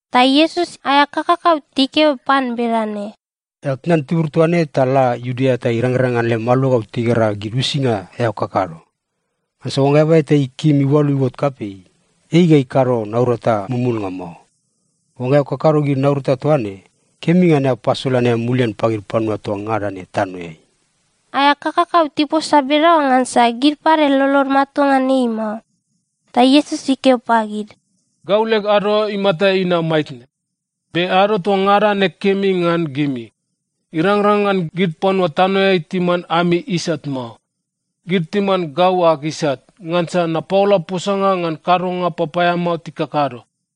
Ta Iesus aea kakakau tikeo pan bedane, “Eao tnan tibur toa ne ta la Iudea ta irangrang ngan lem aluagau tigera gid uisinga eao kakado. Ngansa oangga eaba eta ikim iualu iuot kapei, ei ga ikado naurata mumulnga mao. Oangga eao kakado gid naurata toa ne, kemi ngan eao pasolan eao mulian pagid panua toa ngada ne tanoeai.” Aea kakakau tiposa bedaoa ngansa gid pade lolod matua ngan ei mao. Ta Iesus ikeo pagid, “Gau leg ado imata inam maitne. Be ado toa ngada ne kemi ngan gimi. Irangrang ngan gid panua tanoeai timan ami isat mao. Gid timan gau ag isat, ngansa napaola posanga ngan kadonga papaeamao tikakado.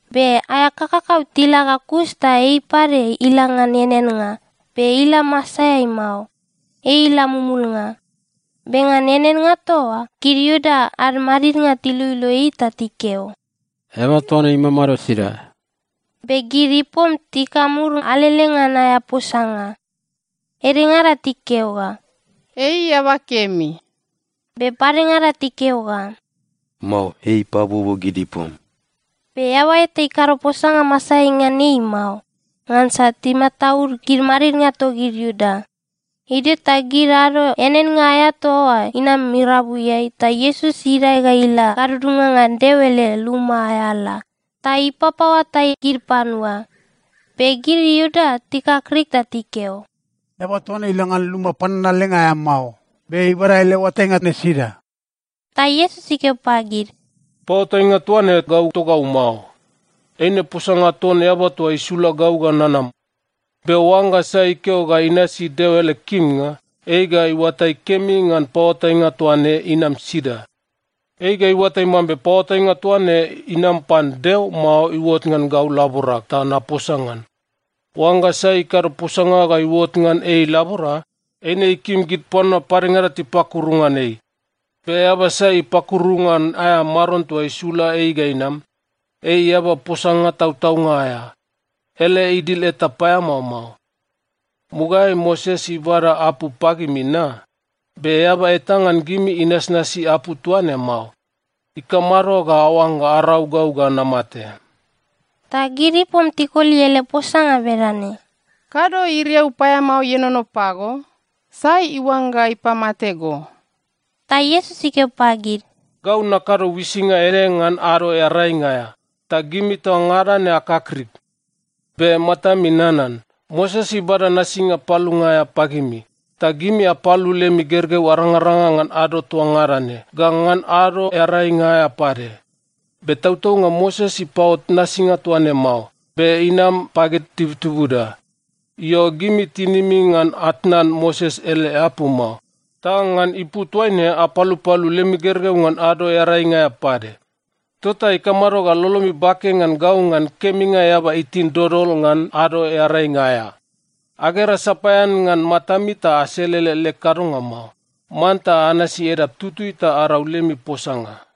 Be aea kakakau tila ga kus ta ei pade ila ngan eaneannga, be ila masaeai mao. Ei ila mumulnga. Be ngan eaneannga toa oa, gid Iuda ad madidnga tiloilo ei ta tikeo, “Eaba toa ne imamado sida?” Be gid ipom tikamur alele ngan aea posanga. Edengada tikeo ga, “Ei eaba kemi.” Be padengada tikeo ga, “Mao. Ei ipabuobuo gid ipom.” Be eaba eta ikado posanga masaeai ngan ei mao, ngansa timataud gid madidnga togid Iuda. Idio ta gid ado eaneannga aea toa oa inam irabuiai, ta Iesus idae ga ila gadudunga ngan Deo ele luma aea ala ta ipapaoatai gid panua. Be gid Iuda tikakrik ta tikeo, “Eaba toa ne ila ngan luma pananalenga aea mao, be ibada ele oatainga ne sida?” Ta Iesus ikeo pagid, “Paoatainga toa ne gau togau mao. Eine posanga ton Eaba toa isula gau ga nanam. Be oangga sai ikeo ga inasi Deo ele kimnga, ei ga iuatai kemi ngan paoatainga toa ne inam sida. Ei ga iuatai mambe paoatainga toa ne inam pan Deo, mao iuot ngan gau laborag ta naposa ngan. Oangga sai ikado posanga ga iuot ngan ei ilabora, eine ikim gid panua padengada tipakuru ngan ei. Be eaba sai ipakuru ngan aea maron toa isula ei ga inam, ei eaba posanga tautaunga aea. Ele idil eta paeamao mao. Mugaeai Moses ibada apu pagimi na? Be eaba eta ngan gimi inasnasi apu toa ne mao. Ikamado ga aoangga arau gau ga namate?” Ta gid ipom tikoli ele posanga bedane, “Kado iriau paeamao ienono pago? Sai iuangga ipamate go?” Ta Iesus ikeo pagid, “Gau nakado uisinga ede ngan Ado Earainga aea, ta gimi toa ngada ne akakrik. Be matami nanan. Moses ibada nasinga palunga aea pagimi. Ta gimi apalu lemi gergeu arangaranga ngan ado toa ngada ne, ga ngan Ado Earainga aea pade. (Be tautaunga Moses ipaot nasinga toa ne mao, be inam pagid tibutibuda.) Io, gimi tinimi ngan atnan Moses ele apu mao. Ta ngan ipu toaine apalupalu lemi gergeu ngan Ado Earainga aea pade. Tota ikamado ga lolomi bake ngan gau ngan keminga eaba itin dodol ngan ado Earainga aea? Agera sapaean ngan matami ta aselele leg kadonga mao. Manta anasi edap tutui ta arau lemi posanga.”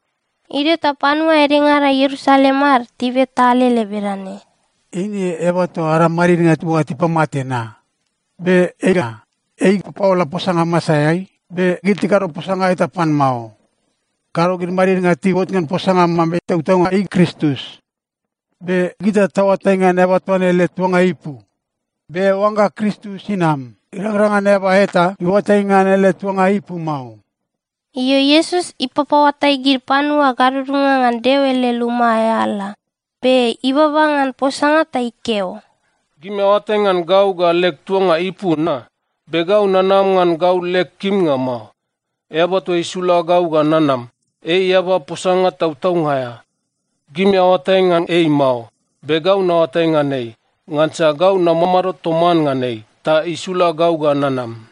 Idio ta panua edengada Ierusalem ad tibeta alele bedane, “Eine eaba toa ada madidnga tiuangga tipamate na? Be ega, ei ipapaola posanga masaeai, be gid tikado posanga eta pan mao. Kado gid madidnga tiuot ngan posanga mambe tautaunga ei Kristus? Be gita taoatai ngan eaba toa ne ele tuanga ipu. Be oangga Kristus inam, irangrang ngan eaba eta iuatai ngan ele tuanga ipu mao.” Io, Iesus ipapaoatai gid panua gadudunga ngan Deo ele luma aea ala, be ibaba ngan posanga ta ikeo, “Gimi aoatai ngan gau ga leg tuanga ipu na? Be gau nanam ngan gau leg kimnga mao. Eaba toa isula gau ga nanam, ei eaba posanga tautaunga aea. Gimi aoatai ngan ei mao. Be gau naoatai ngan ei, ngansa gau namamado toman ngan ei, ta isula gau ga nanam.”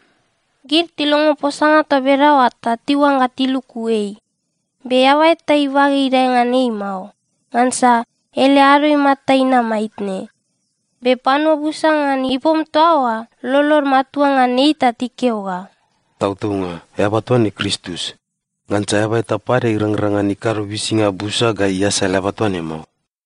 Gid tilongo posanga toa bedaoa, ta tiuangga tiluku ei. Be eaba eta ibage idae ngan ei mao, ngansa ele ado imata inam maitne. Be panua busa ngan ipom toa oa lolod matua ngan ei ta tikeo ga, “Tautaunga eaba toa ne Kristus. Ngansa eaba eta pade irangrang ngan ikado uisinga busa ga iasal eaba toa ne mao!”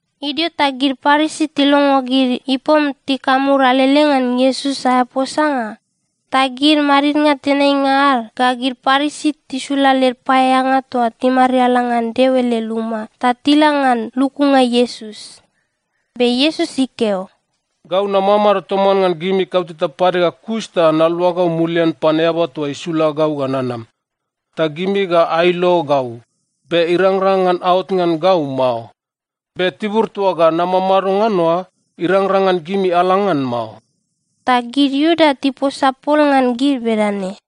Idio ta gid Parisi tilongo gid ipom tikamur alele ngan Iesus aea posanga. Ta gid madidnga tenainga ad ga gid Parisi tisula led paeaeanga toa timariala ngan Deo ele luma, ta tila ngan lukunga Iesus. Be Iesus ikeo, “Gau namamado toman ngan gimi kauteta pade ga kus ta naluagau mulian pan Eaba toa isula gau ga nanam. Ta gimi ga ailo gau, be irangrang ngan aot ngan gau mao. Be tibur toa ga namamado ngan oa, irangrang ngan gimi ala ngan mao.” Ta gid Iuda tiposa pol ngan gid bedane,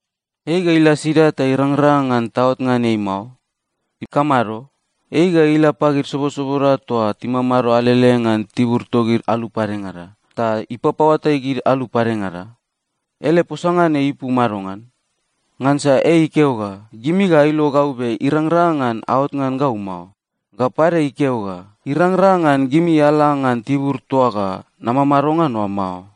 “Ei ga ila sida ta irangrang ngan taot ngan ei mao? Ikamado? Ei ga ila pagid sobosoboda toa timamado alele ngan tibur togid alu padengada, ta ipapaoatai gid alu padengada? Ele posanga ne ipu madongan? Ngansa ei ikeo ga, ‘Gimi ga ailo gau be irangrang ngan aot ngan gau mao.’ Ga pade ikeo ga, ‘Irangrang ngan gimi ala ngan tibur toa ga namamado ngan oa mao.’”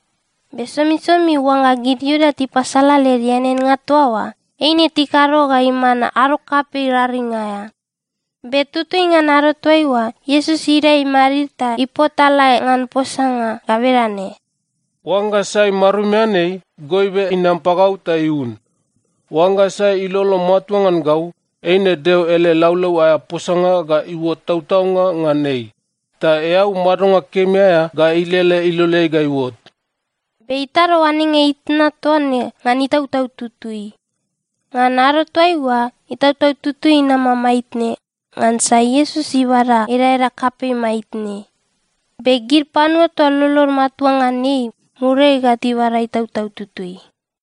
Be somisomi oangga gid Iuda tipasala led eaneannga toa oa, eine tikado ga iman ado kapei raring aea. Be tutui ngan ado toaiua, Iesus idae imadid ta ipotalae ngan posanga ga bedane, “Oangga sai marumian ei, goibe inam pagau ta iun. Oangga sai ilolo matua ngan gau, eine Deo ele laulau aea posanga ga iuot tautaunga ngan ei, ta eau madonga kemi aea ga ilele iloleai ga iuot.” Be itado oanenga itna toa ne ngan Itautau Tutui. Ngan ado toaiua, Itautau Tutui inama maitne, ngansa Iesus ibada edaeda kapei maitne. Be gid panua toa lolod matua ngan ei, muriai ga tibada Itautau Tutui.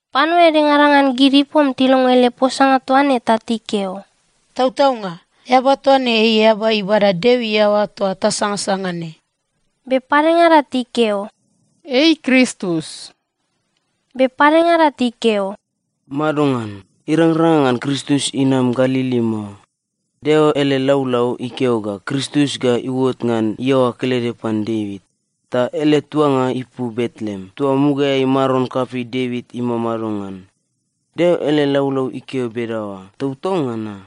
Panua edengada ngan gid ipom tilongo ele posanga toa ne ta tikeo, “Tautaunga, eaba toa ne ei eaba ibada Deo iaoa toa tasangasanga ne.” Be padengada tikeo, “Ei Kristus.” Be padengada tikeo, “Madongan? Irangrang ngan Kristus inam Galili mao. Deo ele laulau ikeo ga Kristus ga iuot ngan iaoa kelede pan Devit, ta ele tuanga ipu Betleem toa mugaeai maron kapei Devit imamado ngan. Deo ele laulau ikeo bedaoa tautaunga na?”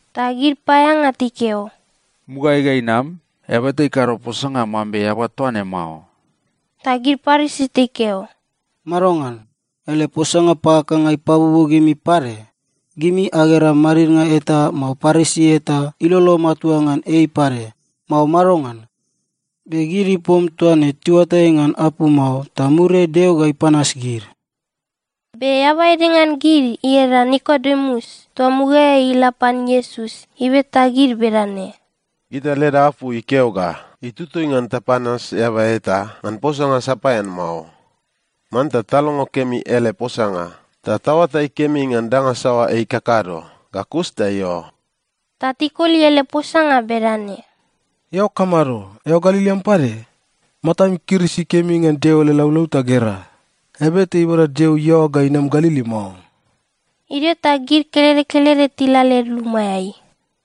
Ta gid paeaeanga tikeo, “Mugaeai ga inam, eaba eta ikado posanga mambe eaba toa ne mao.” Ta gid Parisi tikeo, “Madongan? Ele posanga pakakanga ipabuobuo gimi pade? Gimi agera madidnga eta, mao Parisi eta ilolo matua ngan ei pade, mao madongan? Be gid ipom toa ne tiuatai ngan apu mao, ta muriai Deo ga ipanas gid.” Be eaba ede ngan gid ieda Nikodemus toa mugaeai ila pan Iesus, ibeta gid bedane, “Gita leda apu ikeo ga itutui ngan tapanas eaba eta ngan posanga sapaean mao. Manta talongo kemi ele posanga ta taoatai kemi ngan danga saoa ei ikakado, ga kus ta io.” Ta tikoli ele posanga bedane, “Eao kamado? Eao Galili am pade? Matam ikirisi kemi ngan Deo ele laulau ta gera, eaba eta ibada Deo iaoa ga inam Galili mao.” Idio ta gid kelede kelede tila led lumaeai.